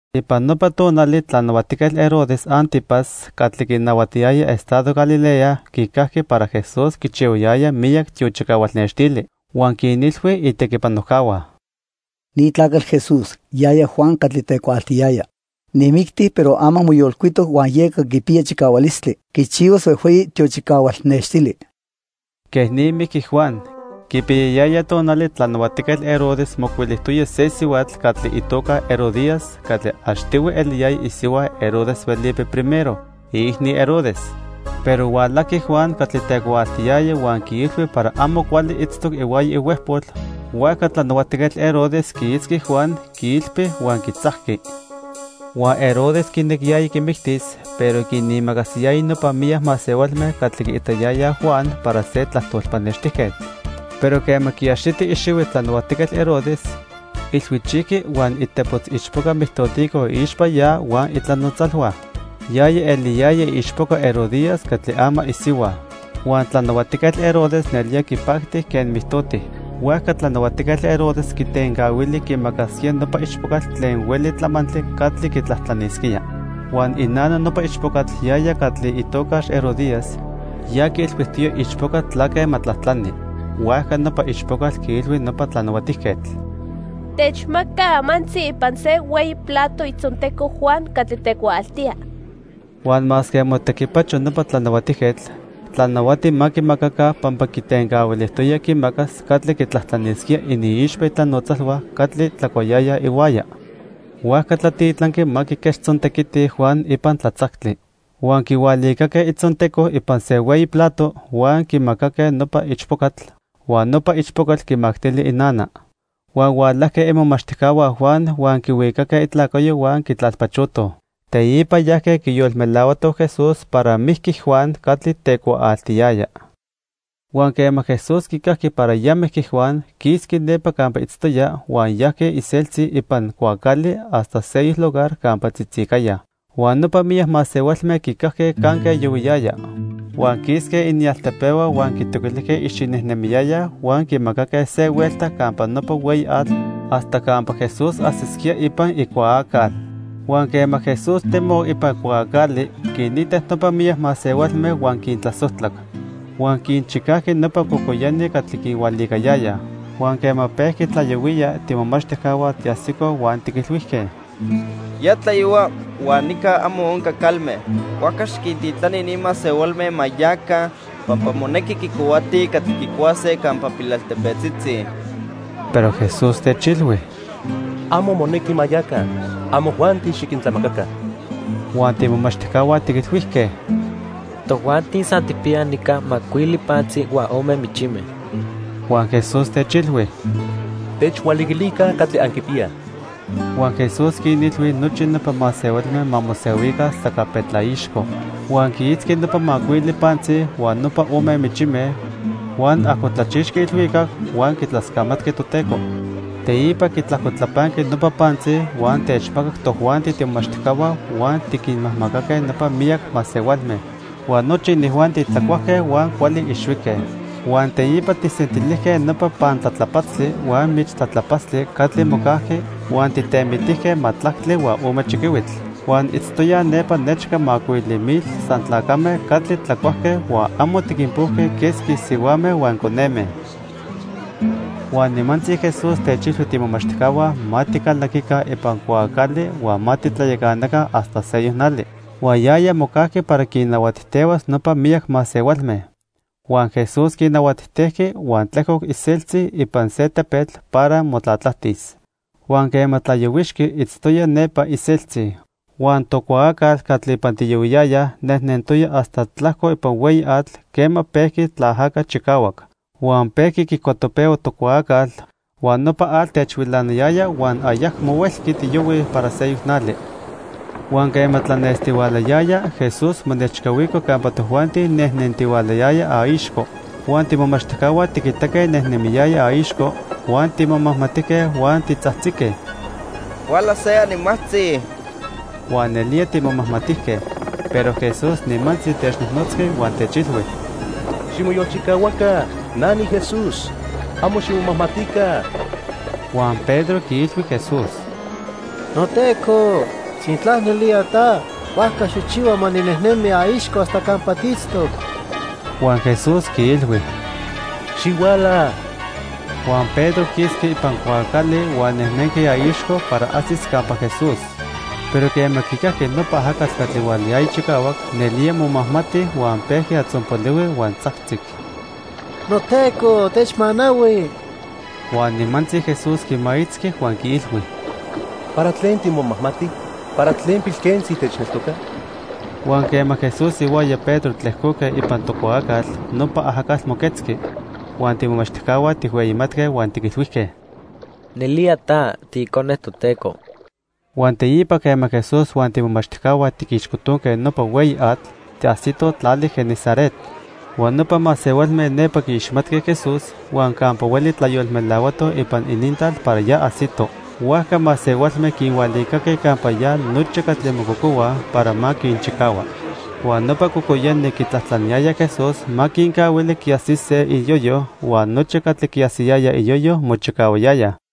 Ipan nopa tonali Tlanahuatijquetl Herodes 'Antipas catli quinahuatiyaya estado Galilea quicajqui para Jesús quichihuayaya miyac tiochicahual nextili. Huan quinilhui itequipanojcahua: "Ni tlacatl Jesús, yaya Juan catli tecuaaltiyaya. Nijmicti, pero ama moyolcuitoc huan yeca quipiya chicahualistli quichihuas huejhueyi tiochicahual nextili." Quej ni mijqui Juan. Quipiyayaya tonali Tlanahuatijquetl Herodes mocuilijtoya se sihuatl catli itoca Herodías catli achtihui eliyaya isihua Herodes Felipe I, iicni Herodes. Pero hualajqui Juan catli tecuaaltiyaya huan quiilhui para amo cuali itztoc ihuaya ihuejpol, huajca Tlanahuatijquetl Herodes quiitzqui Juan, quiilpi huan quitzajqui. Huan Herodes quinequiyaya quimictis pero quinimacasiyaya nopa miyac masehualme catli quiitayayaj Juan para se tlajtol pannextijquetl. Pero quema quiaxiti ixihui Tlanahuatijquetl Herodes, ilhuichijqui huan itepotz ichpoca mijtotico iixpa ya huan itlanotzalhua. Yaya eliyaya iichpoca Herodías catli ama isihua. Huan Tlanahuatijquetl Herodes nelía quipacti quen mijtoti. Huajca Tlanahuatijquetl Herodes quitencahuili quimacasquía nopa ichpocatl tlen hueli tlamantli catli quitlajtlanisquía. Huan inana nopa ichpocatl, yaya catli itocax Herodías, ya quiilhuijtoya iichpoca tlaque ma tlajtlani. Huajca nopa ichpocatl quiilhui nopa tlanahuatijquetl: —Techmaca amantzi ipan se hueyi plato itzonteco Juan catli tecuaaltía. Huan masque motequipacho nopa tlanahuatijquetl, tlanahuati ma quimacaca pampa quitencahuilijtoya quimacas catli quitlajtlanisquía iniixpa itlanotzalhua catli tlacuayayaj ihuaya. Huajca tlatitlanqui ma quiquechtzontequiti, Juan ipan tlatzactli. Huan quihualicaque itzonteco ipan se hueyi plato, huan quimacaque nopa ichpocatl, huan nopa ichpocatl quimactili inana. Huan hualajque imomachtijcahua Juan huan quihuicaque itlacayo huan quitlalpachotoj. Teipa yajque quiyolmelahuatoj Jesús para mijqui Juan catli tecuaaltiyaya. Huan quema Jesús quicajqui para ya mijqui Juan, quisqui nepa campa itztoya, huan yajqui iseltzi ipan cuaacali hasta seyoc lugar campa tzitzicaya. Huan nopa miyac masehualme quicajque canque yohuiyaya. Huan quisque inialtepehua huan quitoquilijque icxinejnemiyayaj huan quimacaque se huelta campa nopa hueyi atl hasta campa Jesús ajsisquía ipan icuaacal. Huan quema Jesús temoc ipan cuaacali, quinitac nopa miyac masehualme huan quintlasojtlac. Huan quinchicajqui nopa cocoyani catli quinhualiquiliyayaj. Huan quema pejqui tlayohuiya, tiimomachtijcahua tiajsicoj huan tiquilhuijque: —Ya tlayohua huan nica amo onca calme. Huajca xiquintitlani ni masehualme ma yaca, pampa monequi quicohuatij catli quicuase campa pilaltepetzitzi. Pero Jesús techilhui: —Amo monequi ma yaca. Amojuanti xiquintlamacaca. Huan tiimomachtijcahua tiquilhuijque: —Tojuanti san tijpiyaj nica macuili pantzi huan ome michime. Huan Jesús techilhui: —Techhualiquilica catli anquipiyaj. Huan Jesús quinilhui nochi nopa masehualme ma mosehuica sacapetlaixco. Huan quiitzqui nopa macuili pantzi huan nopa ome michime, huan ajcotlachixqui ilhuicac, huan quitlascamatqui Toteco. Teipa quitlajcotlapanqui nopa pantzi huan techmacac tojuanti tiimomachtijcahua huan tiquinmajmacaque nopa miyac masehualme. Huan nochi inijuanti tlacuajque huan cuali ixhuique. Huan teipa tijsentilijque nopa pantlatlapatztli huan michtlatlapatztli catli mocajqui, huan tijtemitijque majtlactli huan ome chiquihuitl. Huan itztoyaj nepa nechca macuili mil san tlacame catli tlacuajque huan amo tiquinpojque quesqui sihuame huan coneme. Huan nimantzi Jesús techilhui tiimomachtijcahua ma ticalaquica ipan cuaacali huan ma titlayacanaca hasta seyoc nali. Huan yaya mocajqui para quinnahuatijtehuas nopa miyac masehualme. Huan Jesús quinnahuatijtejqui huan tlejcoc iseltzi ipan se tepetl para motlatlajtis. Huan quema tlayohuixqui, itztoya nepa iseltzi. Huan tocuaacal catli ipan tiyohuiyayaj nejnentoya hasta tlajco ipan hueyi atl, quema pejqui tlaajaca chicahuac. Huan pejqui quicuatopehua tocuaacal, huan nopa atl techhuilanayaya huan ayacmo huelqui tiyohuij para seyoc nali. Huan quema tlanestihualayaya, Jesús monechcahuico campa tojuanti nejnentihualayaya aixco. Huan tiimomachtijcahua tiquitaque nejnemiyaya aixco, huan timomajmatijque huan titzajtzique: —Huala se animajtzi. Huan nelía timomajmatijque. Pero Jesús nimantzi technojnotzqui huan techilhui: —Ximoyolchicahuaca. Na niJesús. Amo ximomajmatica. Huan Pedro quiilhui Jesús: —NoTeco, sintla nelía ta, huajca xijchihua ma ninejnemi aixco hasta campa tiitztoc. Huan Jesús quiilhui: —Xihuala. Huan Pedro quisqui ipan cuaacali huan nejnenqui aixco para ajsis campa Jesús. Pero quema quicajqui nopa ajacatl catli hualayaya chicahuac, nelía momajmati huan pejqui atzonpolihui, huan tzajtzic: —NoTeco techmanahui. Huan nimantzi Jesús quimaitzqui huan quiilhui: —¿Para tlen timomajmati? ¿Para tlen pilquentzi techneltoca? Huan quema Jesús ihuaya Pedro tlejcoque ipan tocuaacal, nopa ajacatl moquetzqui. Huan tiimomachtijcahua tijhueyimatque huan tiquilhuijque: —Nelía ta tiIcone Toteco. Huan teipa quema Jesús huan tiimomachtijcahua tiquixcotonque nopa hueyi atl, tiajsitoj tlali Genesaret. Huan nopa masehualme nepa quiiximatque Jesús huan campa hueli tlayolmelahuatoj ipan inintlal para ya ajsito. Huajca masehualme quinhualicaque campa ya nochi catli mococohuaj para ma quinchicahua. Huan nopa cocoyani quitlajtlaniyayaj Jesús ma quincahuili quiajsise iyoyo, huan nochi catli quiajsiyayaj iyoyo, mochicahuayayaj.